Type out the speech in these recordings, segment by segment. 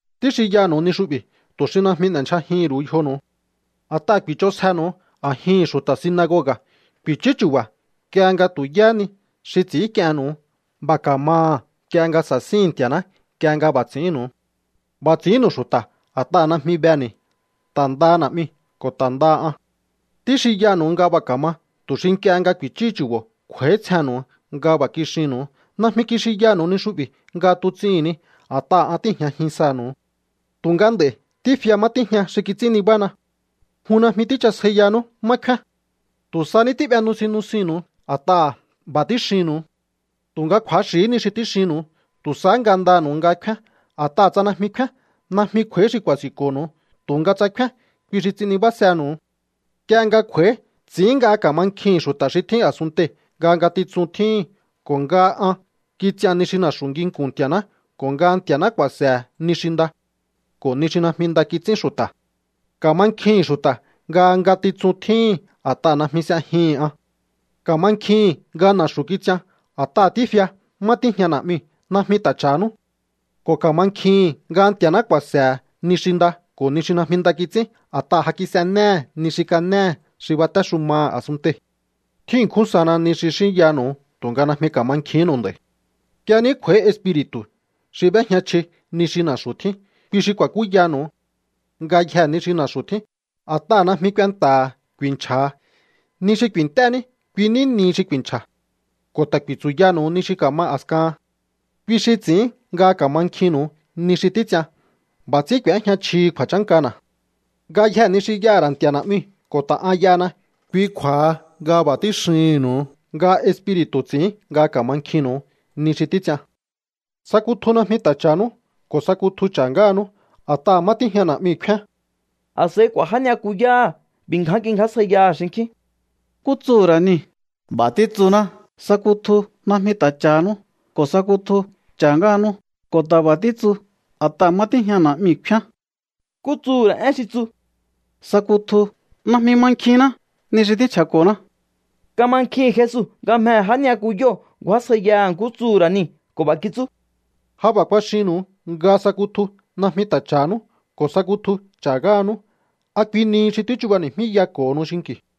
’Tíxinyanu̱u ni xu'bi̱ tu̱ xi najmi n'e̱ndyjajihi̱n ru̱u yjonu̱u. A̱t'aha̱ ku̱i̱ch'onsjenu̱u a̱jihi̱n xu̱ta̱ sinagoga̱. Ku̱i̱chú chu̱ba̱ nk'ie nga tu̱ yáhá ni xi ts'i̱ínk'iennu̱u, b'a̱ ka̱maha̱ nk'ie nga sa̱síhi̱n Nti̱a̱ná nk'ie nga b'a̱ ts'i̱ínnu̱u. B'a̱ ts'i̱ínnu̱u xu̱ta̱ a̱t'aha̱ najmi beni̱, ta̱ ndaha Na̱'miu̱ ko̱ ta̱ ndaha an. Tíxinyanu̱u nga b'a̱ ka̱ma tu̱ xi nk'ie nga ku̱i̱chúhu chu̱bo̱ kj'u̱a̱ítsjehe̱nnu̱u nga b'a̱ kixinnu̱u. ’Najmi kixinyanu̱u ni xu'bi̱ nga tuts'ihi̱n ni a̱t'aha̱ an tíi̱jñajin sanu̱u. Tu̱nga nd'a̱i̱ tífia má tíjña xi kits'ín nibána. Jun najmi tíchasjaiyanú má kfíán. Tu̱ sa ní tí'be nusin nusinnu̱u a̱t'aha̱ b'a̱ tíxinnu̱u. Tu̱nga kju̱axi̱hí ni xi tíxinnu̱u. Tu̱ sahá ngandanu̱u nga kfíán. A̱t'aha̱ tsa najmi kfíán, najmi kj'u̱a̱í xi ku̱a̱si̱nko̱nu̱u. Tu̱nga tsa kfíán, kui xi ts'in nibásenu̱u. ’Nk'ie nga kj'u̱a̱í, ts'i̱ín nga ka̱mankjihi̱n xu̱ta̱ xi tjín a̱sunntei̱ nga ngatitsun tjíhi̱n, ko̱ nga an kits'ian ni xi na̱xu̱ nginku̱n Nti̱a̱ná, ko̱ nga Nti̱a̱ná ku̱a̱se̱he̱ ni xi nda ko̱ ni xi najmi nda kits'ín xu̱ta̱. Ka̱mankjihi̱n xu̱ta̱ nga ngatitsun tjíhi̱n, a̱t'aha̱ najmi s'ejihi̱n an. Ka̱mankjihi̱n nga na̱xu̱ kits'ian, a̱t'aha̱ tífia má tíjña Na̱'miu̱. Najmi ta̱ cha̱hanú. Ko̱ ka̱mankjihi̱n nga Nti̱a̱ná ku̱a̱se̱he̱ ni xi nda ko̱ ni xi najmi nda kits'ín, a̱t'aha̱ ja kis'enéhe̱ ni xi kanéhe̱ xi batéxumaha̱ a̱sunntei̱. ’Tjín ṉkjún sana ni xi xínyanu̱u tu̱nga najmi ka̱makjinnu̱u nd'a̱i̱. Nk'ie ní kj'u̱a̱í Espiri̱tu̱ xi b'éjña chji ni xi na̱xu̱ tjín, kui xi ku̱a̱kúyanu̱u ngayjee̱ ni xi na̱xu̱ tjín. A̱t'aha̱ najmi kuenta̱ha̱ ku̱i̱nchja̱ha. Ni xi ku̱i̱nt'é ní, kui ní nihi xi ku̱i̱nchja̱. Ko̱ ta̱ ku̱i̱tsu̱yanu̱u ni xi ka̱ma a̱skahan. ’Kui xi ts'i̱ín nga ka̱mankjinnu̱u ni xi títs'ian. B'a̱ ts'ín k'u̱éjña chjihi kju̱a̱chánkana̱. Ngayjee̱ ni xi y'aha̱ ra̱ Nti̱a̱ Na̱'miu̱, ko̱ ta̱ an y'ahana. Kui kju̱a̱ha nga b'a̱ tíxihi̱nnu̱u nga Espiri̱tu̱ ts'i̱ín nga ka̱mankjinnu̱u ni xi títs'ian. ’Sa kutju najmi ta̱ cha̱hanú, ko̱ sa kutju cha̱ ngáhanú. A̱t'aha̱ má tíjña Na̱'miu̱ kfíán. A̱s'a̱i k'u̱a̱ já ni'yakuyáha̱ b'i̱ ngján kingjásjaiyaha̱ xinkjín: —¿Nkú tsuhu̱ ra̱ niu̱? B'a̱ títsuná: “Sa kutju najmi ta̱ cha̱hanú ko̱ sa kutju cha̱ ngáhanú.” Ko̱ ta̱ b'a̱ títsu: “A̱t'aha̱ má tíjña Na̱'miu̱ kfíán.” ¿Nkú tsuhu̱ ra̱ én xi tsu: “sa kutju”? Najmi mankjinná ni xi tínchja̱ko̱ná. Kamankjihi̱n Jesu nga mjehe̱ já ni'yakuyóo̱ ngju̱ásjaiyaha̱ nkú tsuhu̱ ra̱ niu̱ ko̱ b'a̱ kitsú: —Ja b'a̱ kuaxinnu̱u nga sa kutju najmi ta̱ cha̱hanú ko̱ sa kutju cha̱ ngáhanú. ¿A kui nihi xi tíchubani̱jmíyako̱honu xinki̱u?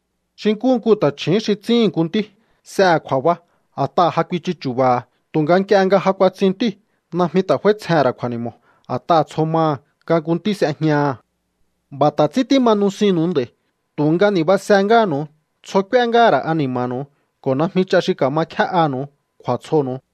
’Xi nkúhu nku ta̱chju̱ún xi tsihi̱n nku ntí, s'ehe̱ kju̱a̱ba a̱t'aha̱ ja kuichu chu̱ba̱ha̱. Tu̱nga nk'ie nga ja kuatsin ntíu̱, najmi ta̱ f'áítsjehe̱n ra̱ kju̱a̱ni̱mo̱, a̱t'aha̱ tsjo maha̱ nga nku ntí s'ejñaha̱. B'a̱ ta̱ ts'ín tíma nusinnu̱u nd'a̱i̱, tu̱nga ni̱basehé ngáha̱nu̱u. Tsjo k'úé ngáha̱ ra̱ ani̱ma̱nu̱u ko̱ najmi ch'a xi ka̱ma kjé'anu̱u kju̱a̱tsjonu̱u.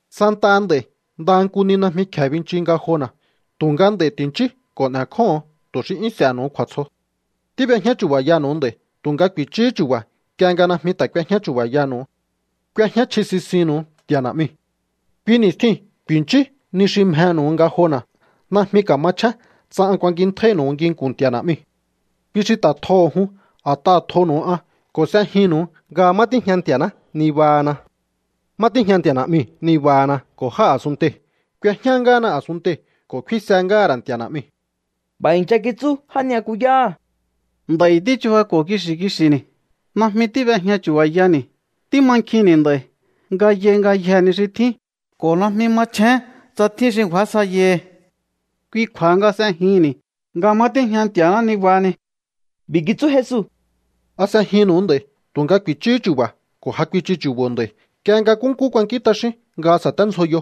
Santaha nd'a̱i̱ ndaha nku ni najmi kje̱e binchiu ngajona̱, tu̱nga nd'a̱i̱ ti̱nchíú ko̱ n'e̱kjóho̱on tu̱ xi 'yún s'e̱he̱nu̱u kju̱a̱tsjo. ’Tíb'ejñá chu̱ba̱yanu̱u nd'a̱i̱ tu̱nga ku̱i̱chúhú chu̱ba̱ nk'ie nga najmi ta̱ k'uejñá chu̱ba̱yaha̱nu̱u. K'uejñá chji sisinnu̱u Nti̱a̱ Na̱'miu̱. Kui ni̱stjiu̱n ku̱i̱nchíú ni xi mjenu̱u ngajona̱. Najmi ka̱machjén tsa an kuankintjáínu̱u nginku̱n Nti̱a̱ Na̱'miu̱. Kui xi ta̱ tjoho̱ jun, a̱t'aha̱ tjonu̱u an ko̱ s'ejinnu̱u nga má tíjña Nti̱a̱ná nibahana. Má tíjña Nti̱a̱ Na̱'miu̱ nibahana ko̱ jáa̱ a̱sunntei̱. K'uejñá ngáhana a̱sunntei̱ ko̱ kfínse ngáha̱ ra̱ Nti̱a̱ Na̱'miu̱. B'a̱ i̱ncha kitsú já ni'yakuyáha̱: —Nd'a̱i̱ tíchubako̱ kixi̱ kixi̱ni̱. Najmi tíb'ejña chu̱ba̱yani̱. Tímankjinni̱ nd'a̱i̱ nga yai ngayjee̱ ni xi tjín ko̱ najmi machjén tsa tjín xi ngju̱ásjaiyahi. Kui kju̱a̱ha nga s'ejihi̱nni̱ nga má tíjña Nti̱a̱ná nibahani. B'i̱ kitsú Jesu: —¿A s'ejinnu̱u nd'a̱i̱? Tu̱nga ku̱i̱chúhú chu̱ba̱ ko̱ ja kuichu chu̱bo̱ nd'a̱i̱ nk'ie nga nkúnkú kuankín t'axíún nga sa̱téndzjoyo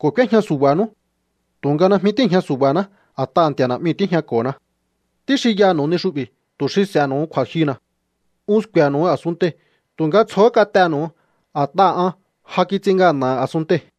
ko̱ k'úéjña su̱ba̱nú. Tu̱nga najmi tíi̱jña su̱ba̱ná, a̱t'aha̱ Nti̱a̱ Na̱'miu̱ tíjñako̱na. Tíxinyanu̱u ni xu'bi̱ tu̱ xi s'e̱he̱nu̱u kju̱a̱jyuna̱. Un sku̱e̱nu̱u a̱sunntei̱, tu̱nga tsjohó kat'enu̱u a̱t'aha̱ an ja kits'in ngana̱ha̱ a̱sunntei̱.